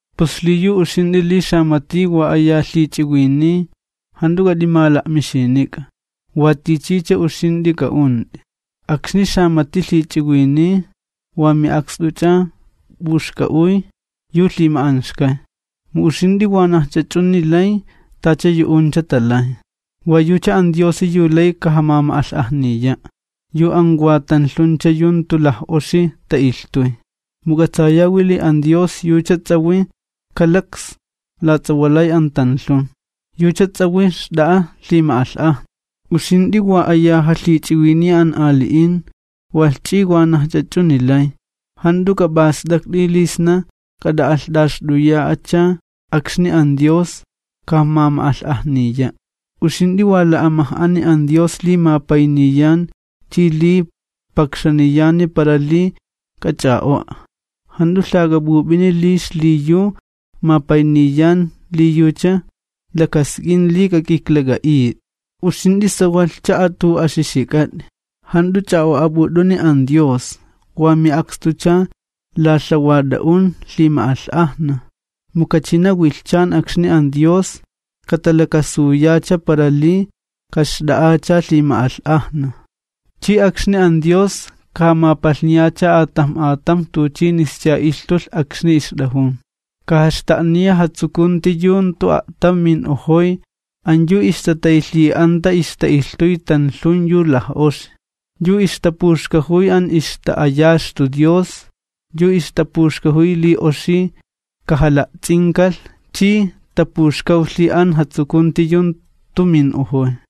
Pus xliyu uxint'i li xamati wa aya lhich'iwiniy, jant'u k'at'imala'mixinik'a, wa tichicha uxint'i k'a'unt'i. Akxni xamat'i lhich'iwiniy wa mi'akst'uch'a p'uxk'a'uy yu lhima'anxkay, mu uxint'i wanajch'a ch'uni lay tacha yu'uncha talay. Wa yucha an Diosi yu lay kajajuna li talhit'ajuni ixtala'alhink'an an yu wa tanlhuncha yu jantu laj'oxi ta'ilhtuy. Mu k'atsayawi li an Dios yucha ts'ajwi kalaks lats'awalay an tanlhun, yucha ts'ajwi xt'a'a lhima'alh'ajna. Uxint'i wa aya jalhich'iwiniya an ali'in, walh ch'i wanajch'a ch'uni lay, jant'u k'ap'ast'akt'i li sna k'at'a'alht'axt'uya'acha akxni an Dios kajamama'alh'ajniya'. Uxint'i wa la'amaj'ani an Dios li mapayniyan chi li pakxaniyan para li k'ach'a'o'a, jant'u lhak'ap'up'ini li xliyu mapayniyan li yucha lakask'in li k'ak'iklak'a'it'i. Uxint'i sawalhcha a'atu'axixik'at'i, jant'u ch'a'o'ap'ut'uni an Dios, wa mi'akstucha lalhawat'a'un lhima'alh'ajna, mu kachina wilhchan akxni an Dios katalakasuyacha para li kaxt'a'acha lhima'alh'ajna, chi akxni an Dios, kajamapalhniyacha atamj atamj tuchinischa ilhtulh akxni ixt'ajun. Kajaxta'niya jatsukunti yu jantu a'tam min'ojoy an yu ixtataylhi'anta ixta'ilhtuy tanlhun yu laj'oxi, yu ixtapuxkajuy an ixta'ayaxtu Dios yu ixtapuxkajuy li oxi kajala'ts'inkalh chi tapuxkawlhi an jatsukunti yu jantu min'ojoy.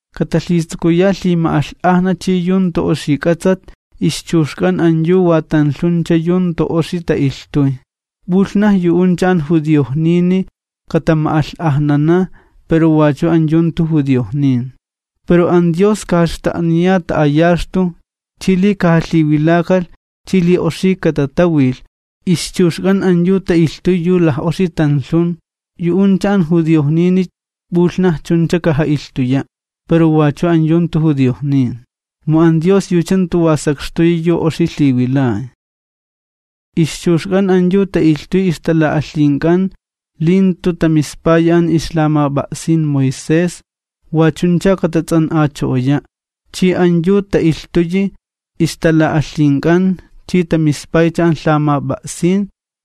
Katalhitsukuya lhima'alh'ajna chi yu jantu oxi k'atsat ixchuxk'an an yu wa tanlhuncha yu jantu oxi ta'ilhtuy, p'ulhnaj yu'uncha an judiojnini katama'alh'ajnana pero wachu an yu jantu judiojnin. Pero an Dios kajaxta'niya ta'ayaxtu chi li kajalhiwilakalh chi li oxi katatawilh, ixchuxk'an an yu ta'ilhtuy yu laj'oxi tanlhun, yu'uncha an judiojnini p'ulhnaj chuncha kaja'ilhtuya', pero wachu an yu jantu judiojnin, mu an Dios yucha jantu wa sakxtuyi yu oxi lhiwilay. Ixchuxk'an an yu ta'ilhtuy ixtala'alhink'an, li jantu tamispayi an ixlamap'a'sin Moisés, wa chuncha katats'an'acho'oya', chi an yu ta'ilhtuyi ixtala'alhink'an chi tamispaycha an lhamap'a'sin,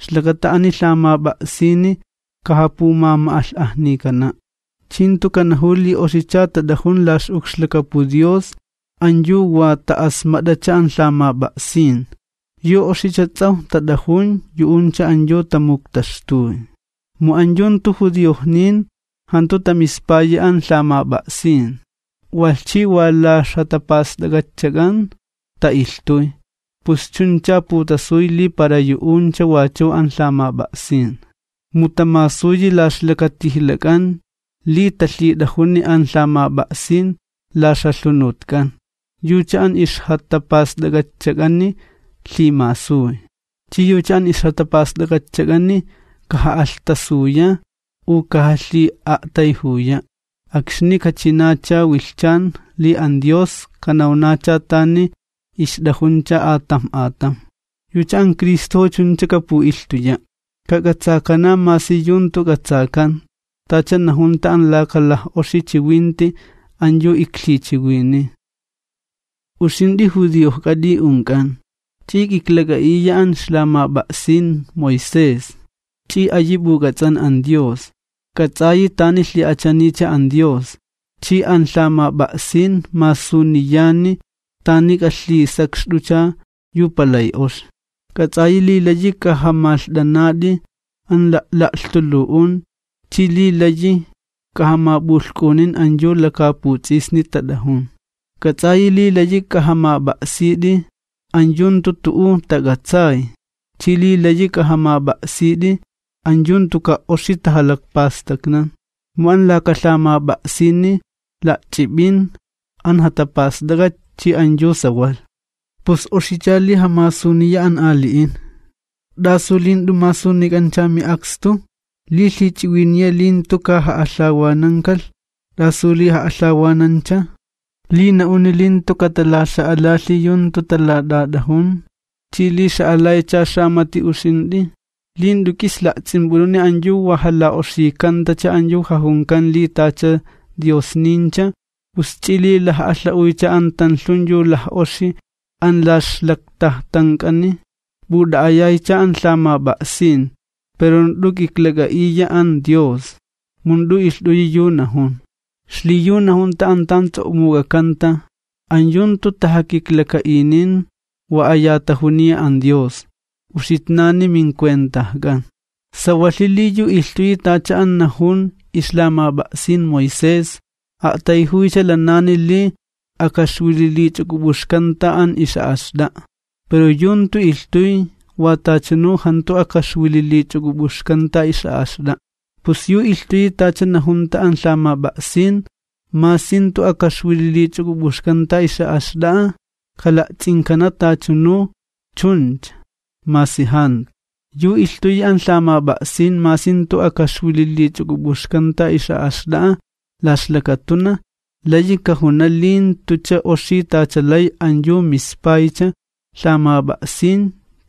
ixlakata ani lhamap'a'sini kajapumama'alh'ajnikana'. Chi jantu kanajuw li oxicha tat'ajun la ix'ukxlakapu Dios an yu wa ta'asmat'acha an lhamap'a'sin, yu oxicha ts'awj tat'ajun yu'uncha an yu tamuktaxtuy. Mu an yu jantu judiojnin jantu tamispayi an lhamap'a'sin, walh chi wa la ixjatapast'ak'atchak'an, ta'ilhtuy, pus chunchacha putasuy li para yu'uncha wachu an lhamap'a'sin. Mu tamasuyi la ixlakatijlak'an li talhit'ajuni an lhamap'a'sin la ixjalhunutk'an, yucha an ixjatapast'ak'atchak'ani lhimasuy. Chi yucha an ixjatapast'ak'atchak'ani kaja'alhtasuya u kajalhi'a'tayjuya akxni kachinacha wilhchan li an Dios kanawnacha tani ixt'ajuncha atamj atamj. Yucha an Cristojo chuncha kapu'ilhtuya'. Kak'atsakana masi yu jantu k'atsakan, tacha najunta an laka laj'oxi chiwinti an yu iklhichiwiniy. Uxint'i judiojk'at'i unk'an, ch'i k'iklak'a'iya an ixlamap'a'sin Moisés, ch'i ayi p'uk'ats'an an Dios. K'ats'ayi tani lhi'achaniycha an Dios, chi an lhamap'a'sin masuniyani tani k'alhisakxt'ucha yu palay oxi. K'ats'ayi li layi k'ajamalht'anat'i an la'la'lhtulu'un chi li layi k'ajamap'ulhk'unin an yu lakaaputs'isni tat'ajun. K'ats'ayi li layi k'ajamap'a'sit'i an yu jantu tu'u tak'atsay chi li layi k'ajamap'a'sit'i an yu jantuka' oxi tajalakpastaknan, mu an laka lhamap'a'sini la'ch'ip'in an jatapast'ak'at chi an yu sawalh. Pus oxich'a li jamasuniya an ali'in, ¿t'asu li jant'u masunik'ancha mi'akstu? Li lhich'iwiniya li jantu kaja'alhawanankalh, ¿t'asu li ja'alhawanancha? Li na'uni li jantu katalaxa'alalhi yu jantu talat'at'ajun, ¿ch'i li xa'alaycha xamati uxint'i? Li jant'u k'is la'ts'imp'ut'uni an yu wa jala'la'oxikantacha an yu jajunkan li tacha diosnincha, ¿p'us ch'i li laj'alha'uycha an tanlhun yu laj'oxi an la ixlaktajtank'ani? P'ut'a'ayaycha an lhamap'a'sin, pero jant'u k'iklak'a'iya an Dios, mu jant'u ilht'uyi yu najun. Xliyu najunta an tan ts'o'muk'akanta: An yu jantu tajakiklaka'inin wa aya tajuniya an Dios, uxitnani mincuentajk'an. Sawalhi li yu ilhtuyi tacha an najun ixlamap'a'sin Moisés, a'tayjuycha lanani li akaxwililich'uk'up'uxkanta an ix'a'axt'a'a. Pero yu jantu ilhtuy, wa tachanu jantu akaxwililich'uk'up'uxkanta ix'a'axt'a'a. Pus yu ilhtuyi tacha najunta an lhamap'a'sin, masi jantu akaxwililich'uk'up'uxkanta ix'a'axt'a'a, kala'ts'inkana tachanu chuncha, masi jantu. Yu ilhtuyi an lhamap'a'sin masi jantu tu'u akaxwililich'uk'up'uxkanta ix'a'axt'a'a la ixlakatunaj, layi kajuna li jantucha oxi tacha lay an yu mispaycha lhamap'a'sin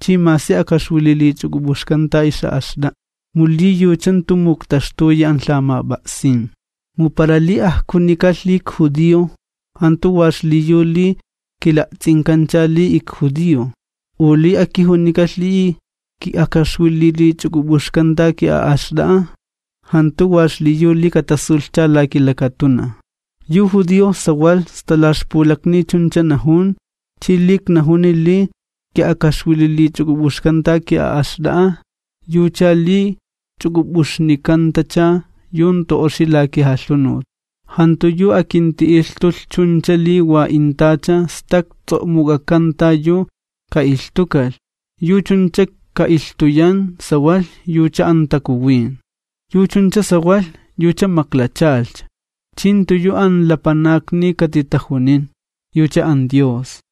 chi masi akaxwililich'uk'up'uxkanta ix'a'axt'a'a, mu li yucha jantu muktaxtuyi an lhamap'a'sin. Mu para li ajkunikalh li ikjudio jantu wa xliyu li kila'ts'inkancha li ikjudio, u li akijunikalh li ki'akaxwililich'uk'up'uxkanta ki'a'axt'a'a jantu wa xliyu li katasulhcha la kilakatunaj. Yu judio sawalh sta la ixpulakni chuncha najun chi li iknajuni li ki'akaxwililich'uk'up'uxkanta ki'a'axt'a'a yucha li ch'uk'up'uxnikantacha yu jantu oxi la kijalhunut. Jantu yu akinti'ilhtulh chuncha li wa intacha stak ts'o'muk'akanta yu ka'ilhtukalh, yu chuncha ka'ilhtuyan sawalh yucha an Takuwin. Yu chuncha sawalh, yucha maklachalhcha, chi jantu yu an lapanakni katitajunin, yucha an Dios.